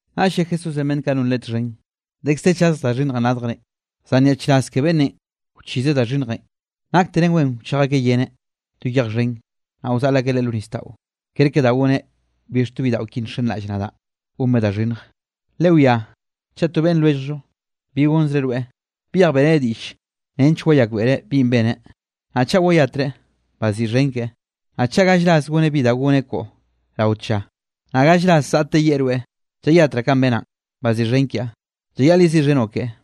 Naꞌll lle Jesúsenꞌ beꞌnn kaꞌ non Leꞌe txhen: —Dekz de chaz da xhinnjenꞌ radjrenꞌ, zan nyaꞌchraz ke beꞌnnenꞌ wchizeꞌ da xhinnjenꞌ. Nakteren wen wchej akeꞌ yeneꞌn to yej xhen, naꞌ wzaꞌl akeꞌ leꞌe lo nisdaꞌo, kerke da goneꞌ bix to bidaꞌo ki nxenraꞌll nadaꞌ gonbeꞌ da xhinnjenꞌ. Lewiá, chaꞌ to beꞌnn lwelljoꞌ, bi gonzreꞌ rweꞌ, byej beꞌreneꞌ diꞌll nench wayakbeꞌreꞌ binꞌ beneꞌ, naꞌ chaꞌ wayatreꞌ, baziꞌxhen keꞌe. Naꞌ chaꞌ gall ras goneꞌ bi da goneꞌ koꞌo rao tlla, naꞌ gall ras zaꞌteꞌ yeꞌe rweꞌ: “Llayatraꞌ kanꞌ benaꞌn, baziꞌxhen kiaꞌ”, llayaꞌl yeziꞌxhenoꞌ keꞌe.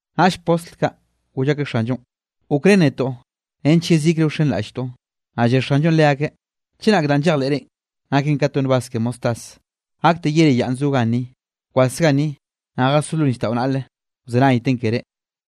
Naꞌll postl kaꞌ, goll akeꞌ Xanllonꞌ: —Gokrén netoꞌ nench yezikre wxenraꞌlltoꞌ. Naꞌ lle Xanllonꞌ leakeꞌ: —Chenak danꞌ llejleꞌre naken ka to nak nbaz ke mostaz, gakte yere yayenꞌ zo ganni: “Bkwas ganni, naꞌ jasó lo nisdaꞌo naꞌle,” wzenayten keré.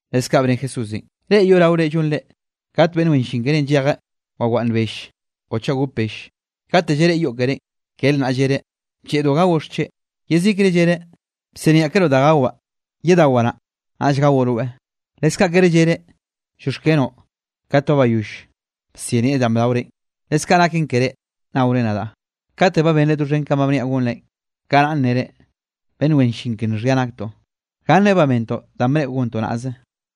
Leskaꞌ bne Jesúsenꞌ: —Reꞌ yoꞌraore llonre, kate beꞌnn wen llin keré llejeꞌ wawaꞌnn belle o chaꞌ gop belle, kate llareꞌe yoꞌ kerénꞌ, kere naꞌ llereꞌ: “Blleꞌdo gaoꞌ xcheꞌ.” Yezikre llereꞌ: “Bsiniaꞌkeroꞌ da gawaꞌ; yedawaꞌ naꞌ, naꞌll gaoꞌ rweꞌ.” Leskaꞌ kere llereꞌ: “Llioxkenoꞌ”, kate ba bayoll bsinieꞌ danꞌ bdaorenꞌ. Leskaꞌ naken ke reꞌ, naore nadaꞌ, kate ba benre doxhen kanꞌ ba bniaꞌ gonre, kanaꞌ nnere: “Beꞌnn wen llin ke nxhia naktoꞌ, gannenꞌ ba bentoꞌ danꞌ bneꞌo gontoꞌ naꞌze.”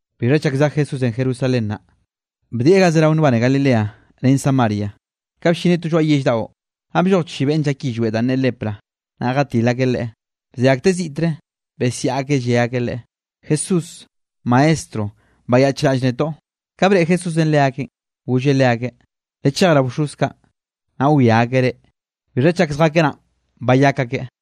Bixha chak zej Jesúsenꞌ Jerusalén naꞌ, bdieꞌ ga zerao nbane Galileanꞌ ren Samaria. Ka bllineꞌ to lloaꞌ yell daꞌo, naꞌ blloj chi beꞌnn llak yillweꞌ danꞌ ne lepra, naꞌ jatil akeꞌ Leꞌe, bze akteꞌ ziꞌtre, besiaꞌ akeꞌ lle akeꞌ Leꞌe: —¡Jesús, Maestro, bayaꞌchraꞌll netoꞌ! Ka breꞌe Jesúsenꞌ leakeꞌn, golleꞌ leakeꞌ: —Lechej rao bxoz kaꞌ, naꞌ wia akeꞌ reꞌ. Bixha chak zjakeꞌ naꞌn, bayak akeꞌ.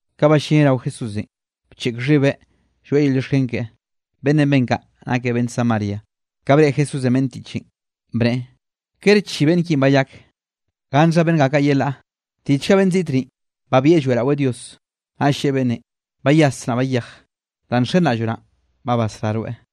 Ka ballineꞌ rao Jesúsenꞌ, bcheꞌk xhibeꞌ lloeꞌ yel llioxken keꞌe, beꞌnnenꞌ ben kaꞌ nakeꞌ beꞌnn Samaria. Ka breꞌe Jesúsenꞌ beꞌnn tiꞌchenꞌ, bneꞌe: —¿Kere chi beꞌnn kinꞌ bayak? ¿Gannxha beꞌnn ga kaꞌ yelaꞌ? ¿Tiꞌchga beꞌnn ziꞌt ni, babieꞌ lloeꞌraweꞌ Dios? Naꞌ lleꞌe beꞌnnenꞌ: —Bayas, naꞌ bayej, danꞌ nxenraꞌlloꞌ naꞌn, ba basrá rweꞌ.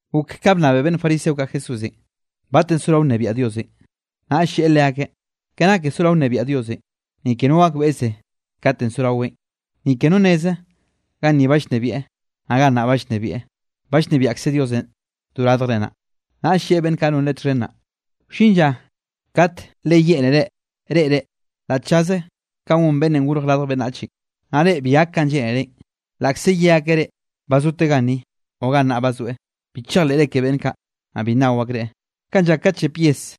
Gok ka bnnabe beꞌnn fariseo kaꞌ Jesúsenꞌ, batenꞌ sorao nnebiaꞌ Diosenꞌ. Naꞌll lleꞌe leakeꞌ: —Ke nake sorao nnebiaꞌ Diosenꞌ, ni ke no gakbeꞌze katenꞌ sorawen. Ni ke no nneze: “Ganni ba llnebieꞌ”, naꞌ “Gannaꞌ ba llnebieꞌ”. Ba llnebiaꞌkze Diosenꞌ do radjrenꞌ nnaꞌ. Naꞌll lleꞌe beꞌnn kaꞌ non Leꞌe txhen naꞌ: —Wllin lla kate le yeꞌnere reꞌre la tllaze kanꞌ gon Beꞌnnenꞌ Gorj Radj Beꞌnnachenꞌ, naꞌ reꞌ bi gak kanꞌ lleꞌnerenꞌ. Laꞌkze ye akeꞌ reꞌ: “Ba zoteꞌ ganni”, o “Gannaꞌ ba zoeꞌ”; bi chejleꞌre ke beꞌnn kaꞌ, naꞌ bi nnao akreꞌ. Kanꞌ llak kate llep yes,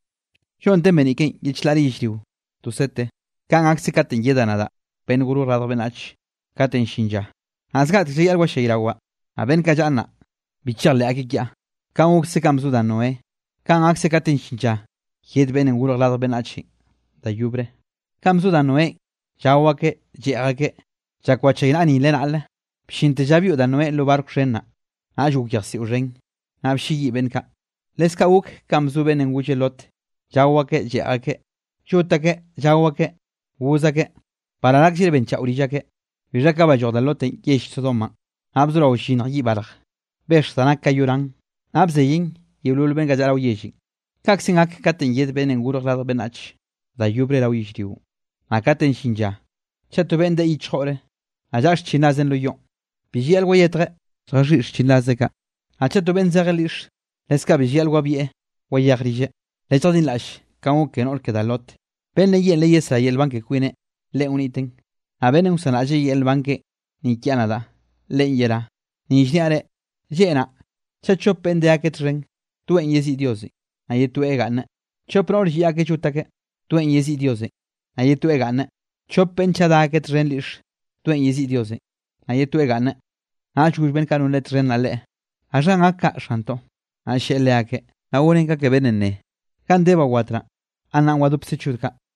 lloꞌnnte beniꞌ ken ye chlaꞌre yellrio to sete, kanꞌ gakse katenꞌ yedaꞌ nadaꞌ, Beꞌnnenꞌ Gorj Radj Beꞌnnach, katenꞌ llin llanꞌ. Naꞌ zgaꞌtek llayaꞌl wallayrawaꞌ, naꞌ beꞌnn kaꞌ llaꞌa nnaꞌ, bi chejleꞌ akeꞌ kiaꞌ. Kanꞌ gokse ka bzo da Noé, kanꞌ gakse katenꞌ llin lla yed Beꞌnnenꞌ Gorj Radj Beꞌnnachenꞌ da yobre. Kanꞌ bzo da Noénꞌ, llao akeꞌ, lleꞌj akeꞌ, llak wchaynaꞌa nile naꞌle, bllinte lla byoꞌ da Noénꞌ lo barco xhen naꞌ, naꞌll gok yejsiꞌo xhen, naꞌ blleyiꞌ beꞌnn kaꞌ. Leskaꞌ gok kanꞌ bzo beꞌnnenꞌ golle Lot, llao akeꞌ, lleꞌj akeꞌ, lloꞌt akeꞌ, llaꞌo akeꞌ, goz akeꞌ, baral akllreꞌ benchaꞌo rill akeꞌ. Bixha ka balloj da Lotenꞌ yell Sodomanꞌ, naꞌ bzorao llyinnj yiꞌ barje, bexj da nak ka yoran, naꞌ bzeyen yeolol beꞌnn kaꞌ llaꞌa rao yellenꞌ. Kaꞌkzenꞌ gak katenꞌ yed Beꞌnnenꞌ Gorj Radj Beꞌnnach da yobre rao yellrionꞌ. ’Naꞌ katenꞌ llin llanꞌ, chaꞌ to beꞌnn deꞌe yichjore, naꞌ llaꞌa xchinraze lo yoꞌn, bi llayaꞌl wayetjeꞌ lljaxhiꞌi xchinrazeꞌ kaꞌ. Naꞌ chaꞌ to beꞌnn zejeꞌ lyiꞌxe, leskaꞌ bi llayaꞌl wabieꞌ wayej rilleꞌ. Lelljadinraꞌll kanꞌ gok ke noꞌr ke da Lot. Beꞌnnenꞌ yeꞌnreꞌ yesrá yel nban ke kwineꞌ, leꞌen wniteꞌn, naꞌ beꞌnnenꞌ wsanraꞌlleꞌ yel nban keꞌen ni kiaꞌ nadaꞌ, leꞌen yerá. ’Ni llniaꞌ reꞌ, lleꞌ naꞌ chaꞌ chop beꞌnn de akeꞌ txhen, toeꞌn yeziꞌi Diosenꞌ naꞌ ye toeꞌ gaꞌnneꞌ. Chop noꞌr lliꞌ akeꞌ llot akeꞌ, toeꞌn yeziꞌi Diosenꞌ, naꞌ ye toeꞌ gaꞌnne. Chop beꞌnn chaꞌ da akeꞌ txhen lyiꞌxe, toeꞌn yeziꞌi Diosenꞌ, naꞌ ye toeꞌ gaꞌnneꞌ. Naꞌll goll beꞌnn kaꞌ non Leꞌe txhen naꞌ Leꞌe: —¿Gaxhanꞌ gak kaꞌ, Xantoꞌ? Naꞌll lleꞌe leakeꞌ: —Naꞌ gonen ka ke beꞌnnenꞌ neꞌe: “Ganꞌ de ba wat naꞌ, gannaꞌn wadopkze chod kaꞌ.”